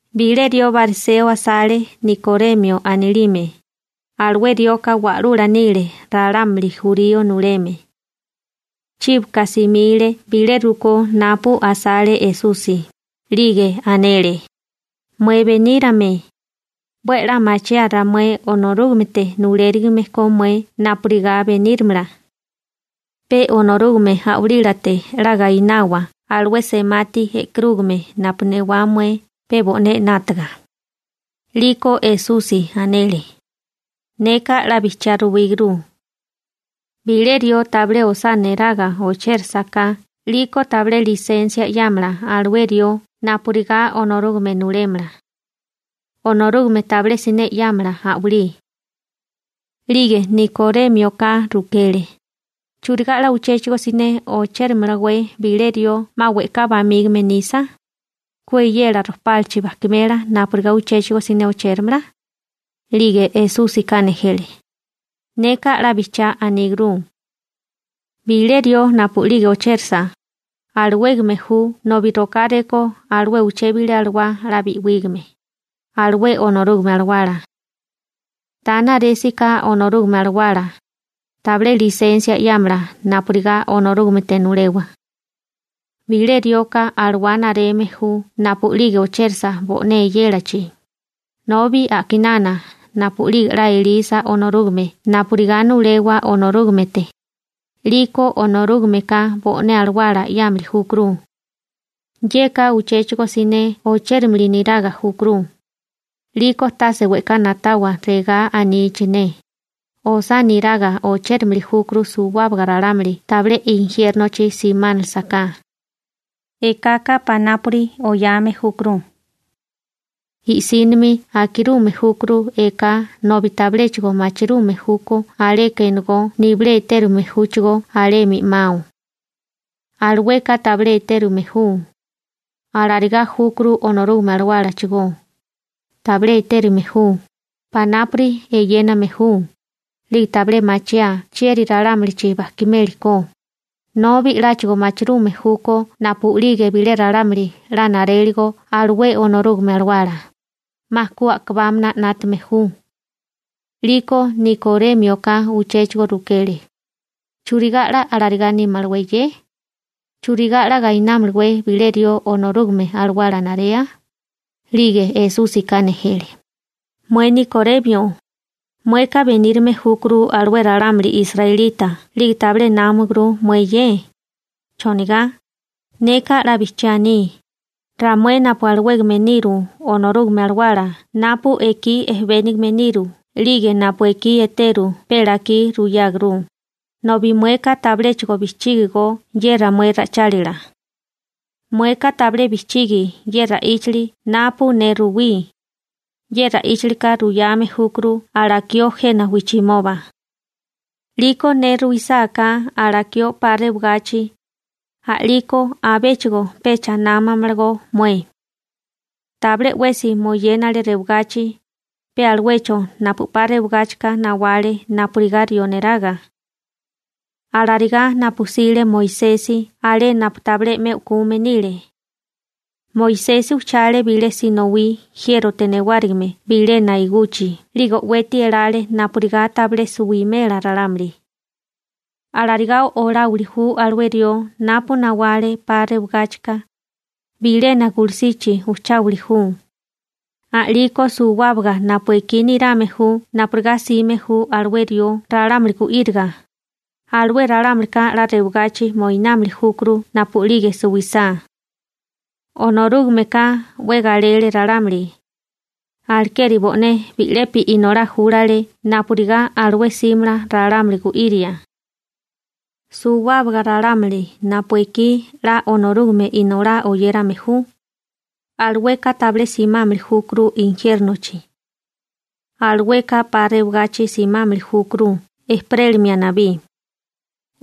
Bilé rió bariseo asale Nikoremio anilime, alué rioka wa'lula nile ralámuli jurío nuleme. Chíboka simile bilé rukó napu asale Esusi, 'lige anele: ―Mué benírame, 'we a'lá machiaa ramué Onorúgamete nulérigime ko mué napurigá beníramala. Pe Onorúgame A'walílate 'la gainawa alué semati e'karúgame napu newá mué pe bo'né 'nátaga. 'Liko Esusi anele: ―Neka 'la bijchiá ruwígurú, bilé rió tabilé osá neraga ochérasaká 'liko tabilé lisensia 'yámala alué rió napurigá Onorúgame nulémala. Onorúgame tabilé siné 'yámala a'walí. 'Lige Nikorémioka rukele: ―¿Churigá 'la uchéchigo siné ochérimalewé bilé rió 'ma we'ká bamígame nisa? ¿Ku eyela rojpálachi bajkimela napurigá uchéchigo siné ochéramala? 'Lige Esúsika nejele: ―Neka 'la bijchiá anígurú. Bilé rió napu'lige ochérasa, alawégame ju nobi rokáré ko alué uché bilé alawá 'la bi'wígame, alué Onorúgame Alawala. Ta naresi ka Onorúgame Alawala, tabilé lisensia 'yámala napurigá Onorúgamete nulewa. Bilé rioka alawá nareme ju napu'lige ochérasa bo'né eyélachi, nobi a'kinana napu'lige 'la elisa Onorúgame napurigá nulewa Onorúgamete, 'liko Onorúgameka bo'né Alawala 'yámili júkuru. Yeka uchéchigo siné ochérilime niraga júkuru. 'Liko tase we'ká na'tawa regá anichi ne: «Osá niraga ochérimili júkuru suwábaga ralámuli tabilé injiérnochi siminálisaká.» Ekaka panápuri oyame júkuru. I'sínimi akirume júkuru eká nobi tabiléchigo machirume júkó aleka enegó nibilé etérume júchigó alemi 'mao. Alueka tabilé etérume ju. Alarigá júkuru Onorúgame Alawálachigó, tabilé etérame ju, panápuri eyéname ju, 'lige tabilé machiaa chieri ralámulichi bajkimeli ko, nobi 'láchigo machirume júkó napu'lige bilé ralámuli 'la naréligo alué Onorúgame Alawala, 'ma ku a'kabámana 'nátame ju. 'Liko Nikorémioka uchéchigo rukele: ―¿Churigá 'la alarigá nímalawé ye? ¿Churigá 'la gainámalawé bilé rió Onorúgame Alawala narea? 'Lige Esúsika nejele: ―Mué Nikoremio, mueka benírame júkuru alué ralámuli israelita 'lige tabilé námaguru mué ye. ¿Chonigá? Neka 'la bijchiá aní: Ramué napu alawégame niru Onorúgame Alawala napu ekí ejebénigame niru 'lige napu ekí eteru pe lakí ruyáguru, nobi mueka tabiléchigo bijchígigo ye ramué ra'ichálila. Mueka tabilé bijchigi ye ra'íchili napu ne ruwí, ye ra'íchilika ruyame júkuru alakió jena wijchimoba. 'Liko ne ruisáká alakió 'pa rewagachi, a'liko abéchigo pecha námamalagó mué. › Tabilé 'wesi moyénale rewagachi, pe aluecho napu 'pa rewagáchika nawale napurigá rió neraga. Alarigá napu 'sile Moisesi alé napu tabilé 'me u'kume nile, Moisesi ujchale bilé sinowí jiérote newárigime bilena iguchi 'lige o'weti elale napurigá tabilé suwimela ralámuli. Alarigá oláwili ju alué rió napu nawale 'pa rewagáchika, bilena gulusichi ujcháwili ju. A'liko suwábaga napu ekí nirame ju napurigá 'sime ju alué rió (napu ju ne Esusi) ralámuli gu'íriga, alué ralámulika 'la rewagachi mochímili júkuru napu'lige suwisá. › Onorúgameka 'we galele ralámuli, alekeri bo'né bi'lepi Inolá júlale napurigá alué 'símala ralámuli gu'iria. Suwábaga ralámuli napu ekí 'la Onorúgame Inolá oyérame ju, alueka tabilé simámili júkuru injiérnochi. Alueka 'pa rewagachi simámili júkuru ejperélimia nabí.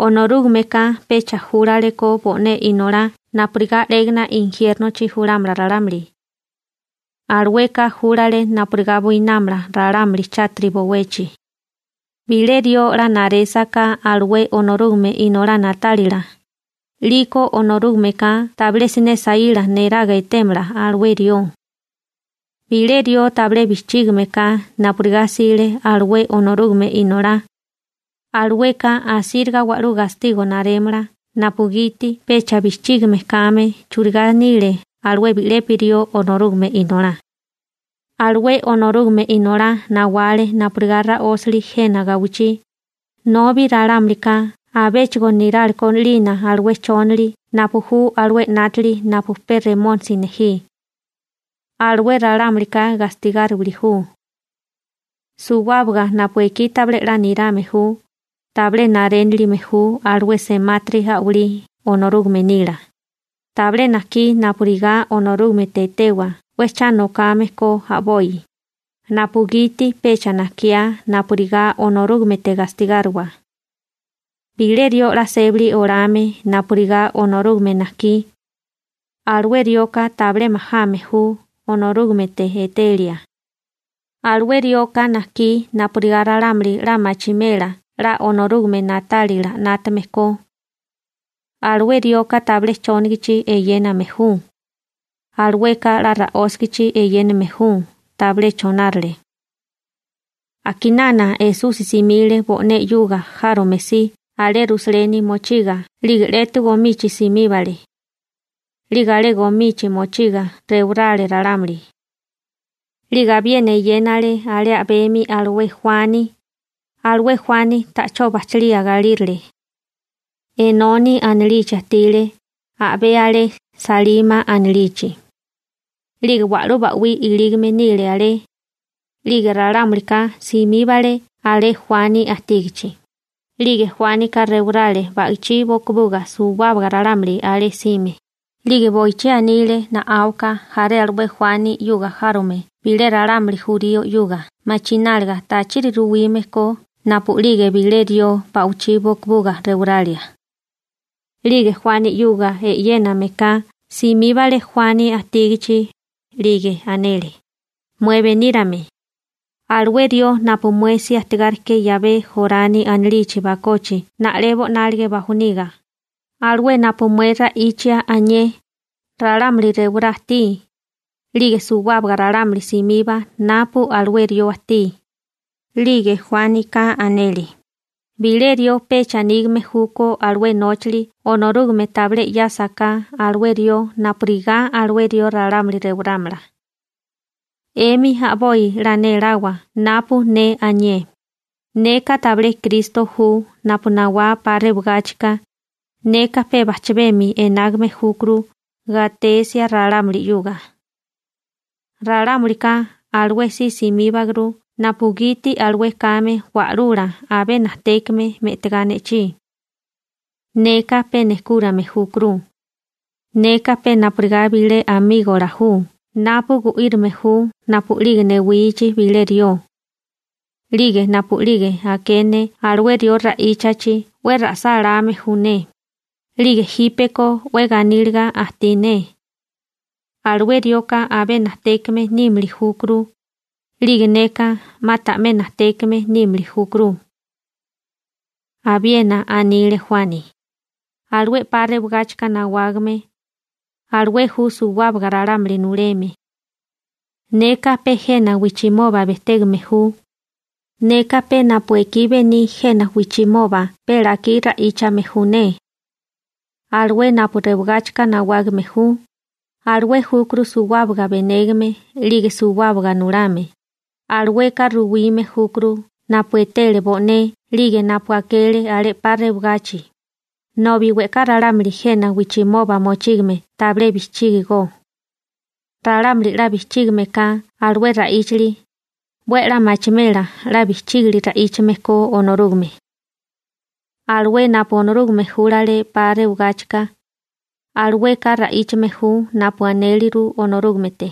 Onorúgameka pecha júlalekó bo'né Inolá napurigá 'légana injiérnochi julámala ralámuli. Alueka júlale napurigá buinámala ralámuli chátiri bowechi. › Bilé rió 'la narésaká alué Onorúgame Inolá na'tálila, 'liko Onorúgameka tabilé siné saíla neraga etémala alué rió. Bilé rió tabilé bijchígime ka napurigá 'sile alué Onorúgame Inolá, alueka asíriga wa'lú gastigo narémala napugiti pecha bijchígime kame churigá nile alué bi'lepi rió Onorúgame Inolá. Alué Onorúgame Inolá nawale napurigá ra'ósili jena gawichí, nobi ralámulika abéchigo niráleko 'lina alué chónali napu ju alué 'nátili napu pe Remónisi nejí. Alué ralámulika gastigáriwili ju. Suwábaga napu ekí tabilé 'la nirame ju, tabilé narénilime ju alué semátiri a'walí Onorúgame nila. Tabilé najkí napurigá Onorúgamete etewa 'we cha nokame ko a'boi, napugiti pecha najkiá napurigá Onorúgamete gastigáriwa. Bilé rió 'la sébili olame napurigá Onorúgame najkí, alué rioka tabilé majame ju Onorúgamete etelia, alué rioka najkí napurigá ralámuli 'la machimela 'la Onorúgame na'tálila 'nátame ko. Alué rioka tabilé chónigichi eyéname ju. Alueka 'la ra'ósigichi eyéname ju, tabilé chonárale. A'kinana Esusi simile bo'né 'yuga járome si alé Rusaleni mochiga 'lige 'letu gomichi simíbale. 'Lige alé gomichi mochiga rewarale ralámuli. 'Lige abiena eyénale alé a'bemi alué Juani, alué Juani ta'chó bajchalía galírale. Enoni anilichi ajtile, a'bé alé Salima anilichi. 'Lige wa'lú ba'wí ilígame nile alé. 'Lige ralámulika simíbale alé Juani ajtígichi, 'lige Juánika rewarale ba'ichí bokobuga suwábaga ralámuli alé jsime. 'Lige boichí anile na'áwaka jaré alué Juani 'yuga járome bilé ralámuli jurío 'yuga machináliga tachiri ruwime ko napu'lige bilé rió ba'wichí bokobuga rewaralia. 'Lige Juani 'yuga e'yénameka simíbale Juani ajtígichi, 'lige anele: ―Mué benírame, alué rió napu mué si ajtigáriké 'yabé Jorani anilichi bakochi na'lebo 'nálige bajoniga, alué napu mué ra'ichia anié, ralámuli rewará ajtí, 'lige suwábaga ralámuli simiba napu alué rió ajtí. 'Lige Juánika anele: ―Bilé rió pecha nígame júkó alué nóchali Onorúgame tabilé 'yásaká alué rió napurigá alué rió ralámuli rewarámala. 'Emi a'boi 'la néláwa napu ne anié: «Neka tabilé Kristo ju napu nawá 'pa rewagáchika, neka pe bajchabemi enágame júkuru gatesia ralámuli 'yuga.» Ralámulika alué si simíbaguru napugiti alué kame wa'lula abé najtékame me'tigá ne'chí. Neka pe nejkúrame júkuru. Neka pe napurigá bilé amígola ju napu gu'írime ju napu'lige newichi bilé rió. 'Lige napu'lige aké ne alué rió ra'íchachi 'we ra'sáláme ju ne, 'lige jípeko 'we ganíliga ajtí ne. Alué rioka abé najtékame nímili júkuru, 'lige neka 'ma ta'mé najtékame nímili júkuru. Abiena anile Juani: ―Alué 'pa rewagáchika nawágame, alué ju suwábaga ralámuli nuleme. Neka pe jena wijchimoba bejtégame ju, neka pe napu ekí bení jena wijchimoba pe lakí ra'íchame ju ne. Alué napu rewagáchika nawágame ju, alué júkuru suwábaga benégame 'lige suwábaga nulame. Alueka ruwime júkuru napu etele bo'né 'lige napu akele alé 'pa rewagachi, nobi we'ká ralámuli jena wijchimoba mochígame tabilé bijchígigó. Ralámuli 'la bijchígime ka alué ra'íchali, 'we a'lá machimela 'la bijchígili ra'íchame ko Onorúgame. Alué napu Onorúgame júlale 'pa rewagáchika, alueka ra'íchame ju napu anéliru Onorúgamete.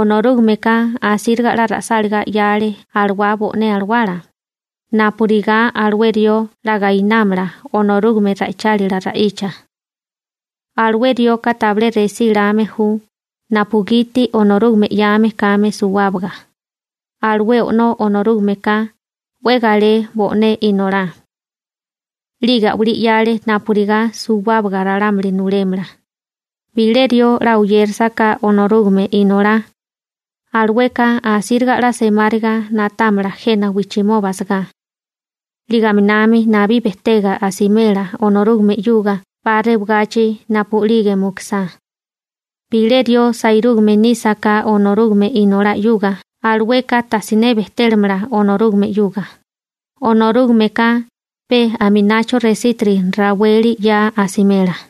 Onorúgameka asíriga 'la ra'sáligá 'yale alawá bo'né alawala, napurigá alué rió 'la gainámala Onorúgame ra'ichálila ra'icha. Alué rioka tabilé resí lame ju napugiti Onorúgame 'yame kame suwábaga. Alué O'nó Onorúgameka 'we galé bo'né Inolá, 'lige a'walí 'yale napurigá suwábaga ralámuli nulémala. Bilé rió 'la oyérasaká Onorúgame Inolá, alueka asíriga 'la semáriga na'támala jena wijchimoba asagá, 'lige aminami nabí bejtega asimela Onorúgame 'yuga 'pa rewagachi napu'lige mukusá. Bilé rió sairúgame nísaká Onorúgame Inolá 'yuga, alueka tajsiné bejtélamala Onorúgame 'yuga, Onorúgameka pe aminacho resítiri raweli 'ya asimela.